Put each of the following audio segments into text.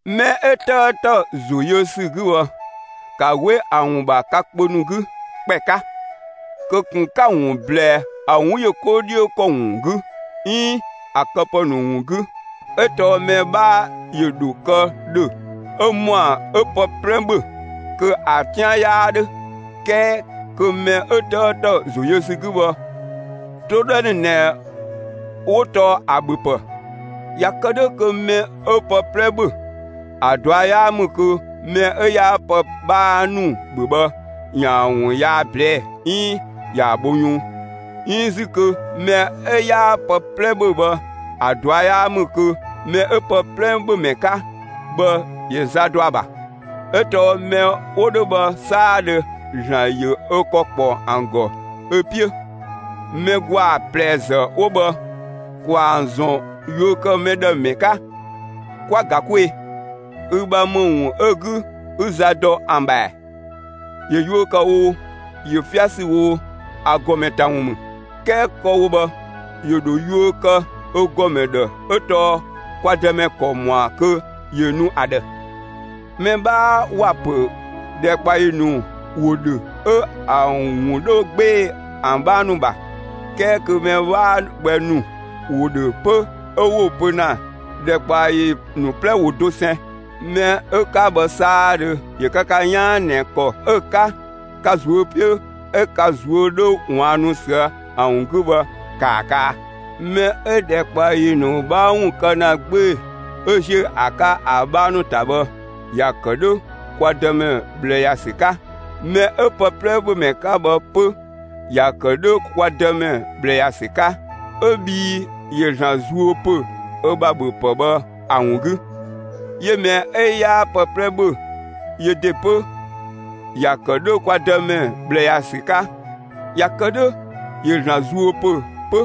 Mɛ 'ö 'tëëtë ‑zo yö ‑sü 'gü bhë, ‑ka 'we ‑a ‑wun ‑bha ka kpö 'gü ‑kpɛ 'ka! Kö ꞊kun 'ka‑ ‑wun ꞊blɛɛ ‑a 'wun yö 'ko 'dhiö ‑kɔ ‑wun 'gü 'iin ‑a këpë ‑nu ‑wun 'gü. 'Ö tɔɔ mɛ 'bhaa ‑yö ‑dho kë ‑dhö 'ö ‑mɔa 'ö pë 'plɛ ‑bhö kö ‑a 'tian 'yaa 'dhö; 'kɛɛ kö mɛ 'ö 'tëëtë ‑zo yö ‑sü 'gü bhë, 'toodhɛ ‑nu ꞊nɛ 'wo tɔɔ ‑a ‑bhö ‑pë. ꞊Ya kë 'dhö kö mɛ 'ö pë 'plɛ ‑bhö, ‑a ꞊dua' 'yaa ‑mü kö mɛ 'ö 'yaa pë 'bhaa ‑nu ‑bhö bhë, ‑ya ‑wun yaa ꞊blɛɛ'‑ 'iin ‑ya bho yunng; 'iin 'zü kö mɛ 'ö 'yaa pë 'plɛ ‑bhö bhë, ‑a ꞊dua' 'yaa ‑mü kö mɛ 'ö pë 'plɛ ‑bhö ‑mɛ 'ka bhë, ‑yö za dɔ ‑a ‑bha. 'Ö tɔɔ mɛ 'wo 'dhö bhë 'saadhö, ‑Zlan ‑yö ö ‑kɔ ‑kpɔ ‑an ‑gɔ ö 'piö. Mɛ ‑gwaa ꞊plɛ ‑zë 'wo bhë, ‑kwaa ‑an ‑zɔn yuö ‑kë mɛ ‑dhë ‑mɛ 'ka, 'kwa‑ ‑ga 'kwee‑! Ü ‑bha ‑më ‑wun 'ö 'gü, 'ü za dɔ ‑an ‑bha ‑ɛɛ? ‑Yö yuö kë oo, ‑yö 'fia ‑sü oo, ‑a ‑gɔmɛ ‑ta ‑wun ‑mü. 'Kɛɛ kë‑ wo bhë, ‑yö ‑dho yuö kë ö ‑gɔmɛ ‑dhë 'ö tɔɔ kwa Dëmɛ ‑kɔ ‑mɔa kö ‑yö nu ‑a ‑dhë. Mɛ 'bhaa ‑wa ‑pö ‑dhɛkpaɔyi ‑nu ‑wo ‑dhö 'ö ‑an ‑wun 'dhö 'gbee‑ ‑an 'bhaa ‑nu ‑bha. 'Kɛɛ kö mɛ 'waa gbɛ ‑nu ‑wo ‑dhö 'pö 'ö 'wo‑ pö ‑na ‑dhɛkpaɔyi ‑nu 'plɛ ‑wo dosɛn. Mɛ 'ö 'ka bhë 'saadhö ‑yö kë ka 'yaan ꞊nɛ ‑kɔ 'ö‑ 'ka ka ꞊zuö' 'piö 'ö ka ꞊zuö' 'dhö ꞊waannu ꞊süë' ‑a ‑wun 'gü bhë, ‑kaa kaa! Mɛ 'ö ‑dhɛkpaɔyi ‑nu 'bhaa ‑wun kë ‑na 'gbee‑ 'ö ‑ziö ‑a 'ka ‑a 'bhaa ‑nu ‑ta bhë, ‑ya ‑kë 'dhö kwa Dëmɛ ꞊bhlë ‑ya ‑sü 'ka. Mɛ 'ö pë 'plɛ ‑bhö ‑mɛ 'ka bhë 'pö, ‑ya ‑kë 'dhö kwa Dëmɛ ꞊bhlë ‑ya ‑sü 'ka, 'ö bhii ‑yö ‑Zlan zuö ‑pö ö ‑bha ‑bhöpë bhë ‑a ‑wun 'gü. 'Yö mɛ 'ö 'yaa pë 'plɛ ‑bhö, yö ‑de 'pö, ‑ya ‑kë 'dhö kwa Dëmɛ ꞊bhlë ‑ya ‑sü 'ka; ꞊ya kë 'dhö, ‑yö ‑Zlan zuö ‑pö 'pö.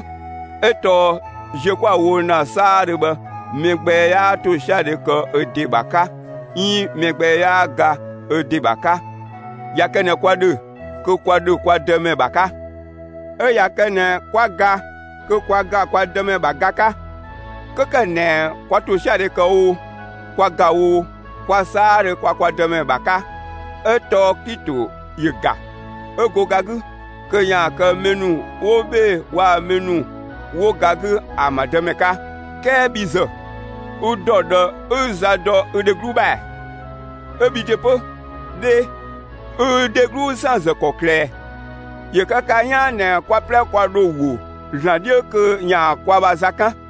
'Ö tɔɔ ziö 'kwa‑ wo ‑na 'saadhö bhë, mɛ gbɛ 'yaa ‑tosiadhe kë ö ‑de ‑bha 'ka 'iin mɛ gbɛ 'yaa ga ö ‑de ‑bha 'ka. ꞊Ya kë ꞊nɛ kwa ‑dhö, kö kwa ‑dhö kwa Dëmɛ ‑bha 'ka; 'ö ꞊ya kë ꞊nɛ 'kwa ga, kö kwa ‑ga kwa Dëmɛ ‑bha ga 'ka. 'Kö ‑kë ꞊nɛ kwa ‑tosiadhe ‑kë oo, kwa ‑ga oo, kwa 'saadhö kwa kwa Dëmɛ ‑bha 'ka. 'Ö tɔɔ Klito ‑yö ‑ga, 'ö go ga 'gü kö ‑yaan kë mɛ ‑nu 'wo 'bhee‑ waa‑ mɛ ‑nu 'wo ga 'gü ‑an ‑bha Dëmɛ 'ka. 'Kɛɛ bhi ‑zë, ü dɔ ꞊dhë 'ü za dɔ ü dheglu ‑bha ‑ɛɛ? 'Ö bhi ‑de 'pö 'dhee, ü ü dheglu ‑san ‑zë ‑kɔklë ꞊ɛ? ‑Yö kë ka 'yaan ꞊nɛ kwa 'plɛ kwa ‑dho ‑wo ‑Zlan 'dhiö kö ‑yaan kwa ‑bha za 'kan,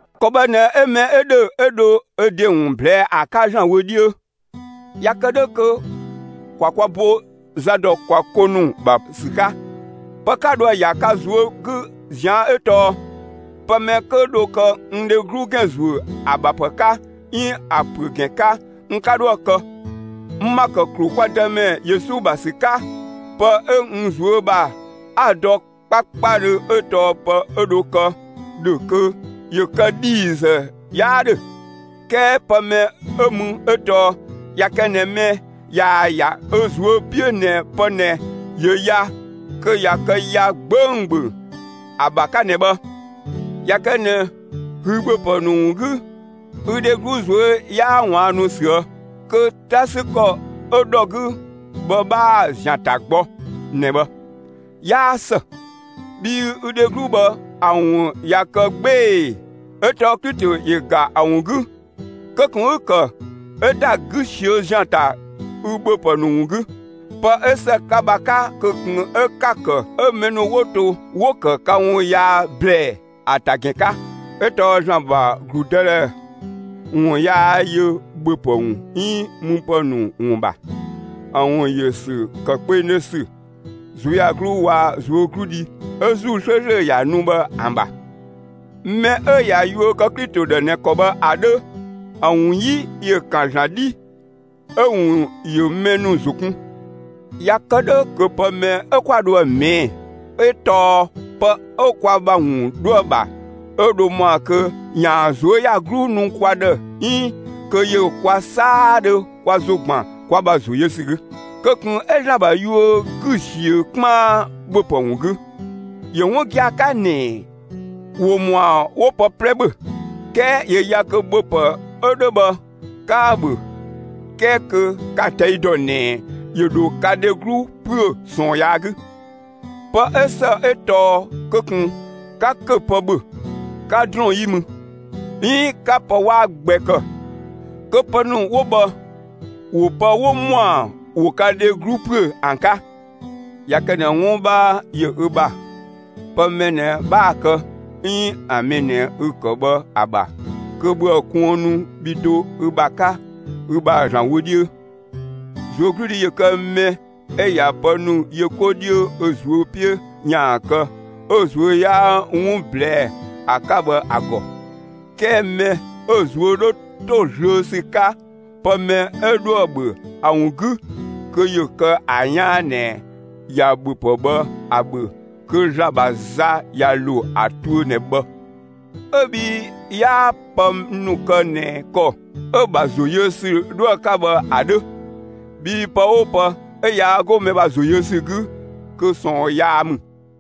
‑Kɔ bhë ꞊nɛ 'ö mɛ 'ö ‑dhö 'ö dho ö ‑de ‑wun ꞊blɛɛ'‑ ‑a 'ka ‑Zlan wö 'dhiö. ꞊Ya kë 'dhö kö ‑kwa kwa bo za ‑dɔ kwa 'ko ‑nu ‑bha ‑sü 'ka. Pë 'ka dhoë‑ ‑ya ka ꞊zuö' 'gü ꞊zian' 'ö tɔɔ: Pë mɛ 'kö dho kë n dheglu ‑gɛn ‑zuö ‑a ‑bha ‑pë 'ka, 'iin ‑a ‑püö ‑gɛn 'ka, n 'ka 'dhoë‑ kë. N ‑ma ‑kë ‑klu kwa Dëmɛ Yesu ‑bha ‑sü 'ka, pë 'ö n ꞊zuö' ‑bha 'a‑ dɔ 'kpakpadhö 'ö tɔɔ pë 'ö dho kë ‑dhö kö ‑yö kë ‑dhiizë, 'yaa 'dhö. 'Kɛɛ pë mɛ 'ö mü 'ö tɔɔ ꞊ya kë ꞊nɛ mɛ ꞊yaa‑ ‑ya ö ꞊zuö' 'piö ꞊nɛ pë ꞊nɛ ‑yö ya, kö ꞊ya kë ya 'gbönggböng ‑a ‑bha 'ka ꞊nɛ bhë. ꞊Ya kë ꞊nɛ ü ‑bhöpë ‑nu ‑wun 'gü, ü dheglu ꞊zuö' 'yaa ꞊waannu ꞊süë', kö 'ta ‑sü ‑kɔ 'ö ‑dhɔ 'gü bhë 'bhaa‑ ‑zian ta gbɔ ꞊nɛ bhë, 'yaa ‑së; bhii ü dheglu bhë, ‑a ‑wun ꞊ya kë 'gbee‑ 'ö tɔɔ Klito ‑yö ga ‑a ‑wun 'gü; kö ꞊kun 'ü‑ ‑kë 'ö ‑da 'gü ꞊siö' ‑zian ‑ta ü ‑bhöpë ‑nu ‑wun 'gü. Pë 'ö ‑së ka ‑bha 'ka kö ꞊kun 'ö 'ka‑ ‑kë 'ö mɛ ‑nu 'wo to 'wo‑ ‑kë ka ‑wun yaa ꞊blɛɛ ‑a ‑ta ‑gɛn 'ka. 'Ö tɔɔ ‑Zlan ‑bha ‑gludëdhɛ ‑wun yaa yö ‑bhöpë ‑wun 'iin müpë ‑nu ‑wun ‑bha. ‑A ‑wun ‑yö ‑sü ‑kë kpengdhö ‑sü, ꞊zuöyagluu waa‑ ꞊zuögludhi 'ö ‑Zuu 'slööslö ‑ya nu bhë ‑an ‑bha. Mɛ 'ö ꞊ya yuö kë Klito ‑dhë ꞊nɛ ‑kɔ bhë ‑a 'dhö, ‑a ‑wun 'yi ‑yö ‑kan ‑Zlan 'dhii, 'ö‑ ‑wun ‑yö mɛ ‑nu ‑zo kun. ꞊Ya kë 'dhö kö pë mɛ 'ö 'kwa dhoë‑ ꞊mɛɛ'‑ 'ö tɔɔ pë 'ö kwa ‑bha ‑wun 'dhoë‑ ‑bha 'ö dho ‑mɔa kö ‑yaan ꞊zuöyagluu nu kwa ‑dhë 'iin kö ‑yö kwa 'saadhö kwa ‑zo ‑gban kwa ‑bha ‑zo yö ‑sü 'gü. Kö ꞊kun 'ü ‑Zlan ‑bha yuö 'gü ꞊siö 'kpaan ‑bhöpë ‑wun 'gü. ‑Yö 'wun gia‑ 'ka ꞊nɛ ‑wo ‑mɔa ‑wo pë 'plɛ ‑bhö. 'Kɛɛ ‑yö ya kö ‑bhöpë 'ö 'dhö bhë, 'ka‑ ‑bhö 'kɛɛ kö ka‑ ꞊tɛi' ‑dɔ ꞊nɛ ‑yö ‑dho ka dheglu ‑püö ꞊sɔɔn yaa 'gü. Pë 'ö ‑së 'ö tɔɔ kö ꞊kun 'ka ‑köpë ‑bhö, 'ka ‑drɔɔn 'yi mü, 'iin 'ka pë 'waa gbɛ ‑kë, kö pë ‑nu 'wo bhë, ‑wo pë 'wo ‑mɔa ‑wo ka dheglu ‑püö ‑an 'ka. ꞊Ya kë ꞊nɛ 'wun 'bhaa yö ü ‑bha pë mɛ ꞊nɛ 'bhaa‑ kë 'iin ‑a mɛ ꞊nɛ 'ü‑ kë bhë ‑a ‑bha, kö ‑bhöë kuënnu bhi do ü ‑bha 'ka ü ‑bha ‑Zlan wö 'dhiö. ꞊Zuögludhi ‑yö kë mɛ 'ö ꞊ya pë ‑nu yö 'ko 'dhiö ö ꞊zuö' 'piö ‑yaan kë 'ö‑ ꞊zuö' 'yaa 'wun ꞊blɛɛ'‑ ‑a 'ka bhë ‑a ‑gɔ. 'Kɛɛ mɛ 'ö‑ ꞊zuö' 'dhö ‑to zlöö ‑sü 'ka pë mɛ 'ö dhoë‑ ‑bhö ‑a ‑wun 'gü, kö ‑yö kë ‑a 'yaan ꞊nɛ ꞊ya ‑bhöpë bhë ‑a ‑bhö, kö ‑Zlan ‑bha za ꞊ya ‑lo ‑a tuö ꞊nɛ bhë, 'ö bhii 'yaa pë ‑nu kë ꞊nɛ ‑kɔ 'ö‑ ‑bha ‑zo yö ‑sü 'dhoë‑ 'ka bhë ‑a 'dhö. Bhii pë 'oo pë 'ö yaa 'go mɛ ‑bha ‑zo yö ‑sü 'gü kö ꞊sɔɔn yaa ‑mü.